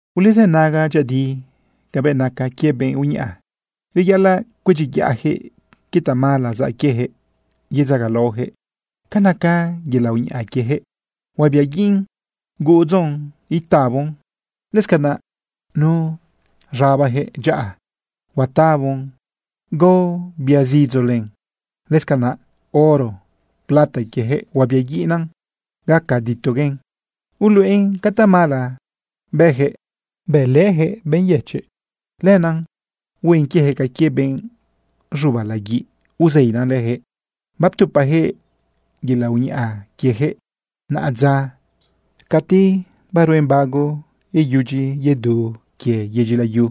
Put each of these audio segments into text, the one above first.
¡Ulezënaga dyëꞌëdi cabëꞌ naca quie benꞌ uñaꞌa! Reyaꞌalaꞌ cuedyiyaꞌyaquëꞌ quie tamala zaꞌ quieyaquëꞌ yedzagalaoyaquëꞌ. Ca naca yelaꞌ uñaꞌa quieyaquëꞌ, huabiaguiꞌn gudzon itabon. Lëscanaꞌ nu z̃abajëꞌ dyaꞌa, huatabon gao biazidzo len. Lëscanaꞌ oro plata quiejëꞌ, huabiaguiꞌna gaca ditoguen. Uluꞌen ca tamala bëjëꞌ bëlëjëꞌ benꞌ yëchiꞌ. Lenaꞌ huen quiejëꞌ ca quie benꞌ z̃uba laguiꞌ, uzeinan leyaquëꞌ. Baptupajëꞌ yelaꞌ uñaꞌa quiejëꞌ naꞌadza cati baruen bago iyudyi yedu quie yedyi layu.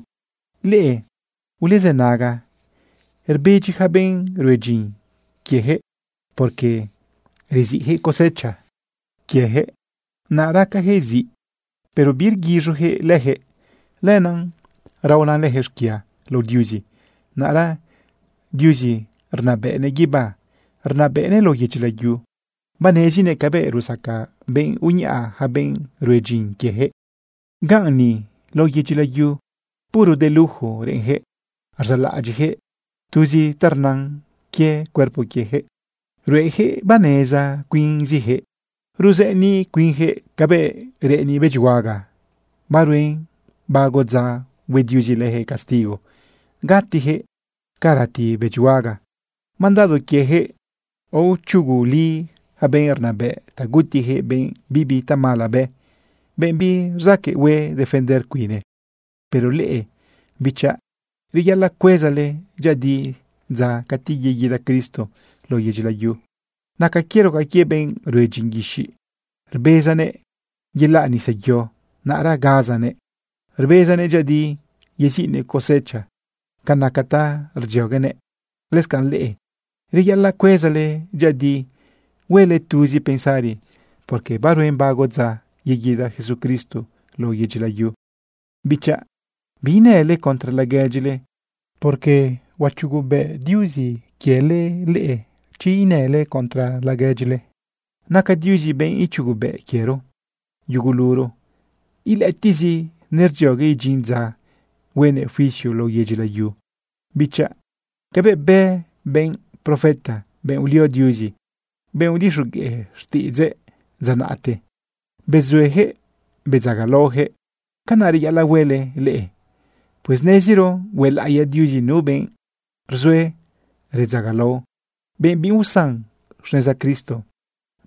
¡Leꞌe ulezënaga! Rbedyi yaca benꞌ rue dyin quiejëꞌ, porque reziꞌjëꞌ cosecha quieyaquëꞌ, naꞌ racayaquëꞌ ziꞌ, pero birguiz̃uyaquëꞌ leyaquëꞌ. Lenaꞌ raona leyaquëꞌ xquia lao Diuzi. Naꞌra Diuzi rnabëꞌnëꞌ guibá, rnabëꞌnëꞌ lao yedyi layu, banezinëꞌ cabëꞌ rusaca benꞌ uñaꞌa yaca benꞌ rue dyin quieyaquëꞌ. Ganꞌ ni lao yedyi layu, puro de lujo reꞌenyaquëꞌ. Rzaꞌlaꞌadyiꞌyaquëꞌ tuz ta rnan quie cuerpo quiejëꞌ. Ruejëꞌ baneza cuinziyaquëꞌ. Ruzëniꞌ cuinyaquëꞌ cabëꞌ reꞌeni bëdyihuaga. Baruen bago dza hue Diuzi leyaquëꞌ castigo gatiyaquëꞌ ca rati bëdyihuaga. Mandado quiejëꞌ aochuguli yaca benꞌ rnabëꞌ ta gutijëꞌ benꞌ bibi tamala bë, benꞌ birzaqueꞌ hue defender cuine. Pero leꞌe bichaꞌ, reyaꞌalaꞌ cuezale dyëꞌëdi dza cati yeguida Cristo lao yedyi layu. Naca quiero ca quie benꞌ rue dyin guixiꞌ. Rbezanëꞌ yelaꞌ nisa yo, naꞌra gazanëꞌ rbezanëꞌ dyëꞌëdi yeziꞌnëꞌ cosecha ca naca ta rdzioguenëꞌ. Lëscanꞌ leꞌe, reyaꞌalaꞌ cuezale dyëꞌëdi huele tuzi pensari, porque baruen bago dza yeguida Jesucristo lao yedyi layu. Bichaꞌ, biinële contra laguedyile, porque huachugubëꞌ Diuzi leꞌe chi inële contra laguedyile. Naca Diuzi benꞌ ichugubëꞌ quiero yuguluro. Ilëꞌëtiꞌzi nerdziogue idyin dza huenëꞌ juicio lao yedyi layu. Bichaꞌ, cabëꞌ bë benꞌ profeta, benꞌ ulio Diuzi, benꞌ udixogueꞌ xtiꞌidzëꞌ dza naꞌte, bezueyaquëꞌ bedzagalaoyaquëꞌ, canaꞌ reyaꞌalaꞌ huele leꞌe. Pues neziro huelaꞌiya Diuzi nu benꞌ rzue redzagalao, benꞌ biusan xneza Cristo.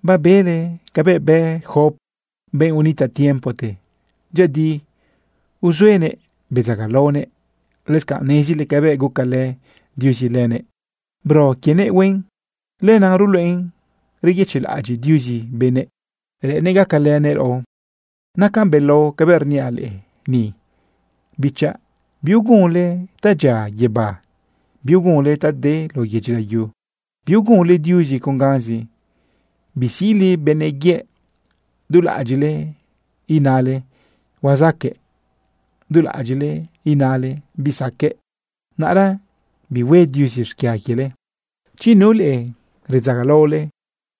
Babele cabëꞌ bë Job, benꞌ unitaꞌ tiempote. Dyëꞌëdi uzuenëꞌ bedzagalaonëꞌ. Lëscanꞌ nezile cabëꞌ gucalë Diuzi lëbëꞌ, bro quienëꞌ huen. Lenaꞌ ruluꞌen reyëchiꞌlaꞌadyiꞌ Diuzi benëꞌ, reꞌennëꞌ gacalënëꞌ raꞌo. Nacan belao cabëꞌ rniaꞌ leꞌe ni, bichaꞌ. Biugunle ta dyia guibá, biugunle ta de lao yedyi layu. Biugunle Diuzi con ganzi. Bisiꞌle benëꞌ yëꞌ. Dulaꞌadyiꞌle inale: “Huazaqueꞌ”, dulaꞌadyiꞌle inale: “Bisaqueꞌ”. Naꞌra bihue Diuzi xquia quiele. Chi nu leꞌe redzagalaole,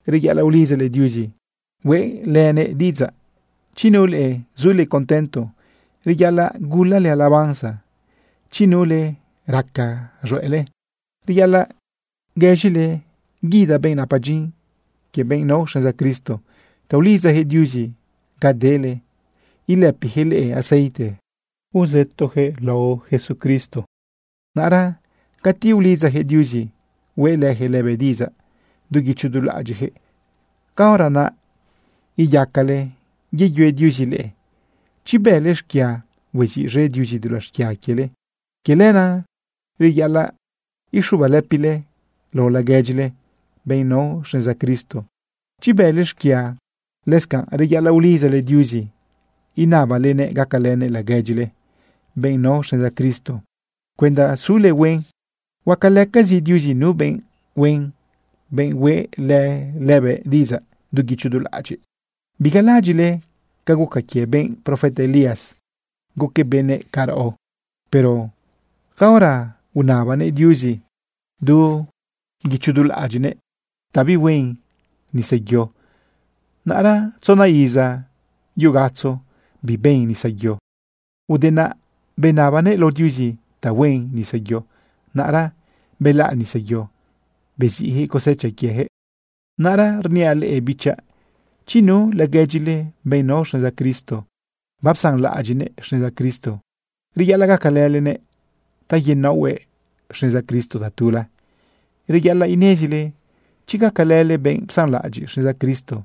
reyaꞌalaꞌ ulidzale Diuzi hueꞌlënëꞌ diꞌidzaꞌ. Chi nu leꞌe sule contento, reyaꞌalaꞌ gulale alabanza. Chi nu leꞌe raca z̃hueꞌle, reyaꞌalaꞌ guëz̃ile guida benꞌ napa dyin quie benꞌ nao xneza Cristo ta ulidzajëꞌ Diuzi ga dele ilëpiyaquëꞌ leꞌe aceite rzëtoyaquëꞌ lao Jesucristo. Naꞌra cati ulidzayaquëꞌ Diuzi hueꞌlëyaquëꞌ lëbëꞌ diꞌidzaꞌ du guicho du laꞌadyiꞌyaquëꞌ, caora naꞌ iyacale yeyue Diuzi leꞌe. Chi bële xquia, hueziꞌz̃e Diuzi dulaꞌ xquia quiele. Quie lenaꞌ reyaꞌalaꞌ ixubalëpile lao laguedyile, benꞌ nao xneza Cristo, chi bële xquia. Lëscanꞌ reyaꞌalaꞌ ulidzale Diuzi inabalenëꞌ gacalënëꞌ laguedyile, benꞌ nao xneza Cristo, cuenda sule huen. Huacalëcazi Diuzi nu benꞌ huen, benꞌ hueꞌlë lëbëꞌ diꞌidzaꞌ du guicho du laꞌadyiꞌ. Bigalaꞌadyiꞌle ca guca quie benꞌ profeta Elías. Guquëꞌ benëꞌ ca raꞌo. Pero caora unabanëꞌ Diuzi du guicho du laꞌadyiꞌnëꞌ ta bihuen nisayo, naꞌra tzona iza yu gatzo biben nisayo. Ude naꞌ benabanëꞌ lao Diuzi ta huen nisayo, naꞌra belaꞌ nisayo, beziꞌyaquëꞌ cosecha quieyaquëꞌ. Naꞌra rniaꞌ leꞌe bichaꞌ. Chi nu laguedyile, benꞌ nao xneza Cristo, bapsanlaꞌadyiꞌnëꞌ xneza Cristo, reyaꞌalaꞌ gacalëlenëꞌ ta yenaohuëꞌ xneza Cristo tatula. Reyaꞌalaꞌ inezile chi gacalële benꞌ psanlaꞌadyiꞌ xneza Cristo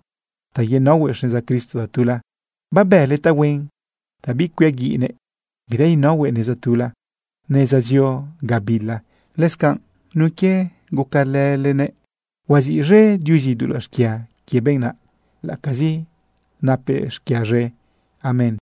ta yenaohuëꞌ xneza Cristo tatula, babële tahuen ta bicuiaguiꞌnëꞌ bira inaohuëꞌ neza tula, neza zio gabila. Lëscanꞌ nun quie gucalëlenëꞌ, huaziꞌz̃e Diuzi dulaꞌ xquia quie benꞌ naꞌ, laꞌacazi napëꞌ xquia z̃e. Amén.